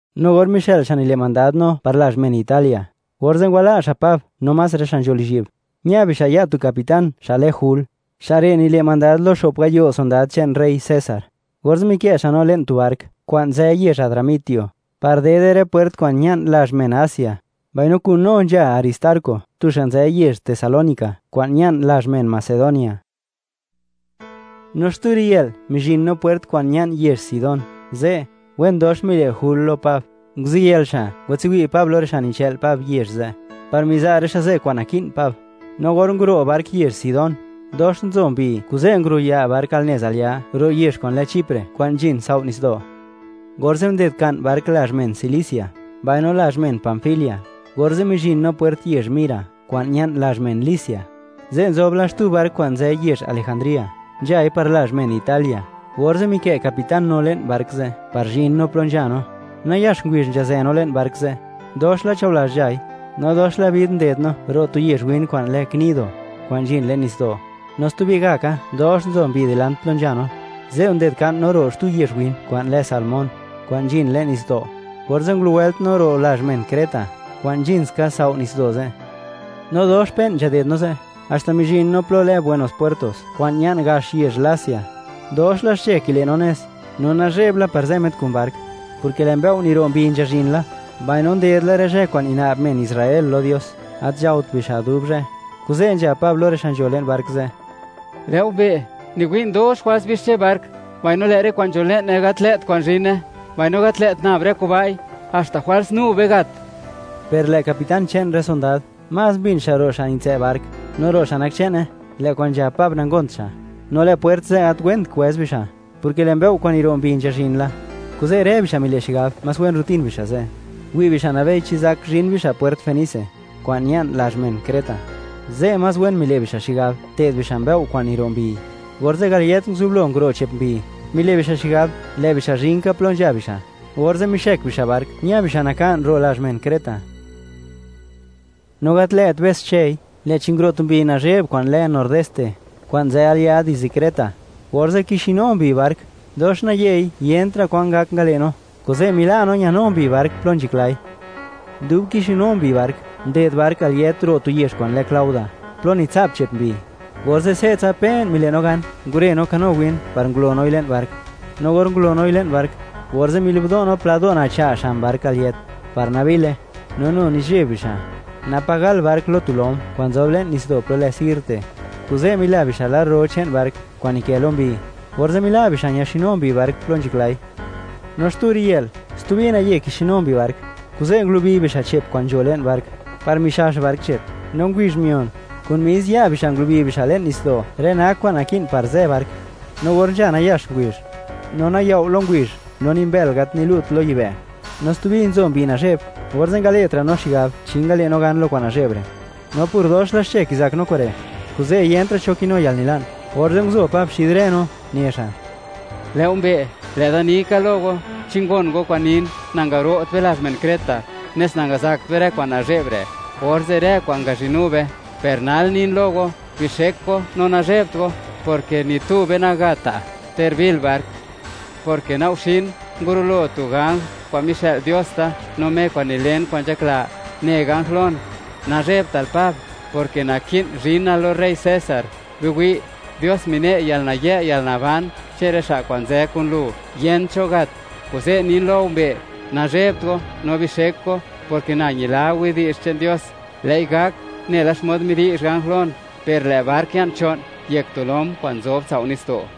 No or mixë'l xa' nile' mandad no par lazh men Italia, orze' ngwala' xa' Pab no más rë xa' nzho lizhyi'b, ña bixa' ya' tu capitán xa' lë Jul. Xa' re' nile' mandad lo xo'p gayo' sondad che'n rey César. Orze' mikë' xa' no le'n tu bark kwa'n nzë yezh Adramitio, par dede rë pwert kwa'n ña'n lazh men Asia. Mbaino kun no nzha Aristarco, tu xa' nzë yezh Tesalónica kwa'n ña'n lazh men Macedonia. No xtu riyë'l mizhin no pwert kwa'n ña'n yezh Sidón. Ze', wen dox mile' Jul lo Pab, nguziyël xa' ngwatswi' Pab lo rë xa' nichë'l Pab yezh ze', par miza' rë xa' ze' kwa'n naki'n Pab. No or nguro' bark yezh Sidón, dox nzo mbi, kuze' nguruya' bark al nez al ya' ro' yezh kwa'n lë Chipre, kwa'n nzhin tsao' nitsdo'. Orze' nded nka'n bark lazh men Cilicia, mbaino lazh men Panfilia, orze' mizhin no pwert yezh Mira kwa'n ña'n lazh men Licia. Ze' nzob la xtu bark kwa'n nzë yezh Alejandría, nzhai par lazh men Italia, orze' mikë' capitán no le'n bark ze' par zhin no plo nzha no. Nayax ngubizh nzhazë no le'n bark ze', dox la chaolazh nzhai, no dox la bid nded no ro' tu yezh win kwa'n lë Gnido, kwa'n nzhin le'n nitsdo', no stubi gak ka, dox nzo mbi dilant plo nzha no, ze' nded nka'n no ro' xtu yezh win kwa'n lë Salmón, kwa'n nzhin le'n nitsdo', orze' ngulowëlt no ro' lazh men Creta, kwa'n nzhin ska tsao' nitsdo' ze'. No dox pe'n nzhaded no ze', haxta mizhin no plo lë Buenos Puertos, kwa'n ña'n gax yezh Lasea. Dox la xche kile' no nez, no nazhe'b la par zë met kun bark, porke lë' mbëo' niro' mbi mizhin la, mbaino nded la rë zhë kwa'n nina'b men Israel lo Dios, gat nzhaot bixa' dub zhë. Kuze', nzhab Pab lo rë xa' nzho le'n bark ze': ―Lë'o mbee'; niwi'n, dox jwals bixche bark mbaino lë' rë kwa'n nzho le'ne gat lë't kwa'n zhine; mbaino gat lë't nab rë kuba'i, haxta jwals nu be gat. Per lë' capitán che'n rë sondad, más mbin xa' ro' xa' nitsë' bark, no ro' xa' nak che'ne; lë' kwa'n nzhab Pab nangont xa'. No lë' pwert ze' gat went kwëz bixa', porke lë' mbëo' kwa'n niro' mbi nzhazhin la. Kuze' rë bixa' mile' xigab, más wen rutin bixa' ze', wi' bixa' nabei chi zak zhin bixa' pwert Fenice, kwa'n ña'n lazh men Creta; ze' más wen mile' bixa' xigab te'd bixa' mbëo' kwa'n niro' mbi. Orze' gal yët nguzublo nguro' che'p mbi, mile' bixa' xigab, lë' bixa' zhin ka plo nzha bixa', orze' mixëk bixa' bark, ña bixa' naka'n ro' lazh men Creta. No gat lë't be's xchëi, lë'chi nguro' tu mbi nazhe'b kwa'n lë Nordeste, kwa'n nzë al ya' dizde Creta. Orze' kixonu mbi bark, dox nayei, yentra' kwan ngak ngale' no, kuze' mila' no ñanu mbi bark plo nzhaklai. Dub kixonu mbi bark, nded bark al yët ro' tu yezh kwa'n lë Clauda, plo nitsa'p che'p mbi. Orze' se'tsa pe'n mile' no gan ngure no kano win par ngulo noi le'n bark. No or ngulo noi le'n bark, orze' mili'bdo' no pla do' nacha' xan bark al yët, par nabile, no nu nizheb bixa', napa' gal bark lo tu lom kwa'n nzob le'n nitsdo' plo lë Sirte, kuze' mila bixa' lar ro che'n bark kwa'n nikë lo mbi, orze' mila' bixa' ñaxonu mbi bark plo nzhaklai. No xtu riyë'l, stubi naye kixonu mbi bark, kuze' ngulubi bixa' che'p kwa'n nzho le'n bark, par mixax bark che'p. No ngubizh mion, kun mis ya' bixa' ngulubi bixa' le'n nitsdo', rë nak kwa'n naki'n par zë bark. No or nzha nayax ngubizh, no nayao' lo ngubizh, no ni mbël gat nilu't lo yibë', no stubi nzo mbi nazhe'b, orze' ngale'tra' no xigab, chi ngale' no gan lo kwa'n nazhe'b re'. No por dox la xche kizak no kure', kuze' yentra' cho kinu yalnila'n, orze' nguzo Pab xid rë no, ne xa': ―Lë' go mbee', lë' da ni ka lo go, chi ngon go kwa'n nin, nangaro't be lazh men Creta, nes nangazakt be rë kwa'n nazhe'b re', orze' rë kwa'n ngazhinu be. Per nal nin lo go, bixek go no nazhebt go, porke ni tu be nagatta'; ter bil bark, porke na'g guxin, ngurulo tu ganj kwa'n mixë'l Dios da, no Me nilen kwa'n nzhakla. Ne ganj lon: “Nazhebtal Pab, porke naki'n zhinal lo rey César. ¡Biwi'! Dios mine' yalnayë' yalnaban che'n rë xa' kwa'n nzë kun lu. Yent cho gat.” Kuze' nin lo go mbee', nazhebt go no bixek go; porke na ñila widi'zh che'n Dios, lë'i gak nela xmod midi'zh ganj lon. Per lë' bark ya'n cho'n yek tu lom kwa'n nzob tsao' nitsdo'.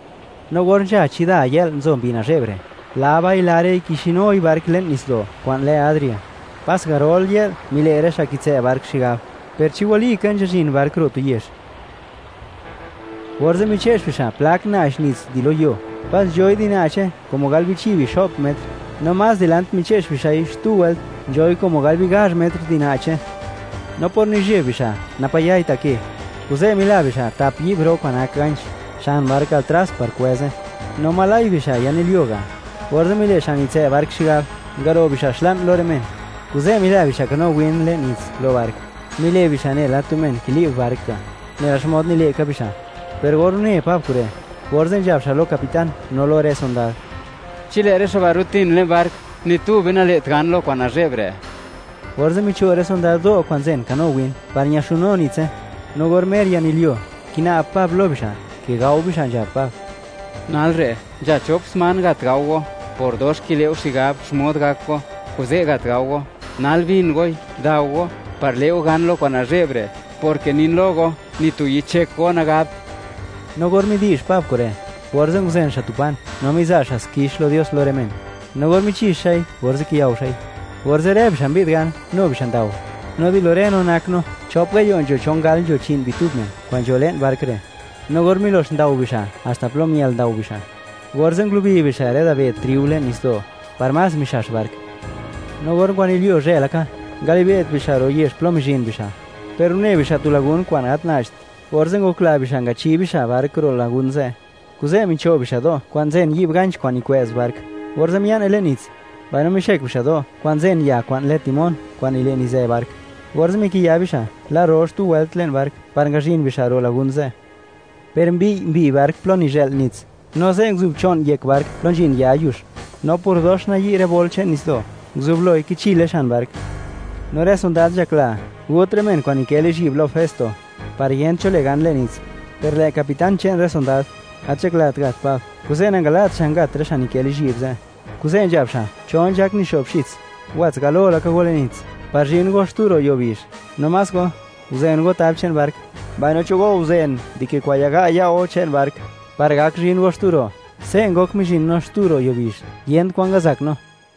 No or nzha chida yë'l nzo mbi nazhe'b re', laba'i-lare'i kixinui bark le'n nitsdo' kwa'n lë Adria, pas garol yë'l mile' rë xa' kitsë' bark xigab, ¿per chi walika nzhazhin bark ro' tu yezh? Orze' miche'x bixa' plak na'ch nits di lo yuo, pas nzhoi di na'che como gal bichi' bixo'p metr; no más dilant miche'x bixa'i xtu wëlt, nzhoi como gal bigazh metr di na'che. No por nizheb bixa', napa' yai ta' ke, kuze' mila bixa' tap yi'b ro kwa'n nak ganch, xan bark al tras par kwëze; mbaino ngokla bixa', oj yanilyuo ga'. Orze' mile' xa' nitsë' bark xigab, ngaro' bixa' xla'n lo rë men. Kuze' mila bixa' kano win le'n nits lo bark, mile' bixa' nela tu men kili'b bark ga', nela xmod nile' ka bixa'. Per or une Pab kure', orze' nzhab xa' lo capitán, no lo rë sondad: ―Chi lë' rë xa' ba' rutin le'n bark, ni tu be nale't gan lo kwa'n nazhe'b re'. Orze' micho' rë sondad do' kwa'n nzen kano win, par ñaxunu nitse. No or mer yanilyuo, kina'b Pab lo bixa', ke gao bixa', nzhab Pab: ―Nal re', nzha chop sman, gat gao go; por dox kile' go xigab xmod gak go, kuze' gat gao go. Nal bin goi, dao go, par le' go gan lo kwa'n nazhe'b re', porke nin lo go, ni tu yichyek go nagabt. No or midi'zh Pab kure', orze' nguzen xa' tu pan, no miza' xa' xkix lo Dios lo rë men, no or michi'x xa'i, orze' kiyao xa'i. Orze' rë bixa' mbi'd gan, nu bixa' ndao. No di lo rë no, nak no chop gayo' nzho chon gal nzho chi'n bitub men kwa'n nzho le'n bark re'. No or milo'x ndao bixa' haxta plo miël ndao bixa', orze' ngulubi bixa' rë dabed triu le'n nitsdo', par más mixax bark. No or ngwanilyuo zhë laka, ngali'be't bixa' ro' yezh plo mizhin bixa'; per une bixa' tu lagún kwa'n gat na'cht, orze' ngokla bixa' ngachi bixa' bark ro' lagun ze'. Kuze', micho' bixa' do' kwa'n nzen yi'b ganch kwa'n nikwë'z bark, orze' mia'ne le'n nits; mbaino mixëk bixa' do' kwa'n nzen ya kwa'n lë timón kwa'n nile' nizë bark, orze' mikiya bixa' lar ro xtu wëlt le'n bark par ngazhin bixa' ro' lagún ze'. Per mbiy' mbi bark plo nizhë'l nits, no ze' nguzobcho'n yek bark plo nzhin ya yux. No por dox nayi' rë bol che'n nitsdo', nguzubloi kichile xan bark. No rë sondad nzhakla, gut rë men kwa'n nikë lizhyi'b lo Festo, par yent cho le' gan le'n nits. Per lë' capitán che'n rë sondad, gat nzhaklat gat Pab; kuze' nangala't xa' ngat rë xa' nikë' lizhyi'b ze', kuze' nzhab xa': “Cho nzhak nixo'bxits, wats galo laka go le'n nits, par zhin go xtu ro' yuo bizh. No más go, guzen go tab che'n bark, mbaino cho go guzen di ke kwa'n yaga' ya' go che'n bark, par gak zhin go xtu ro'.” Se' ngok mizhin no xtu ro' yuo bizh, yent kwan ngazak no.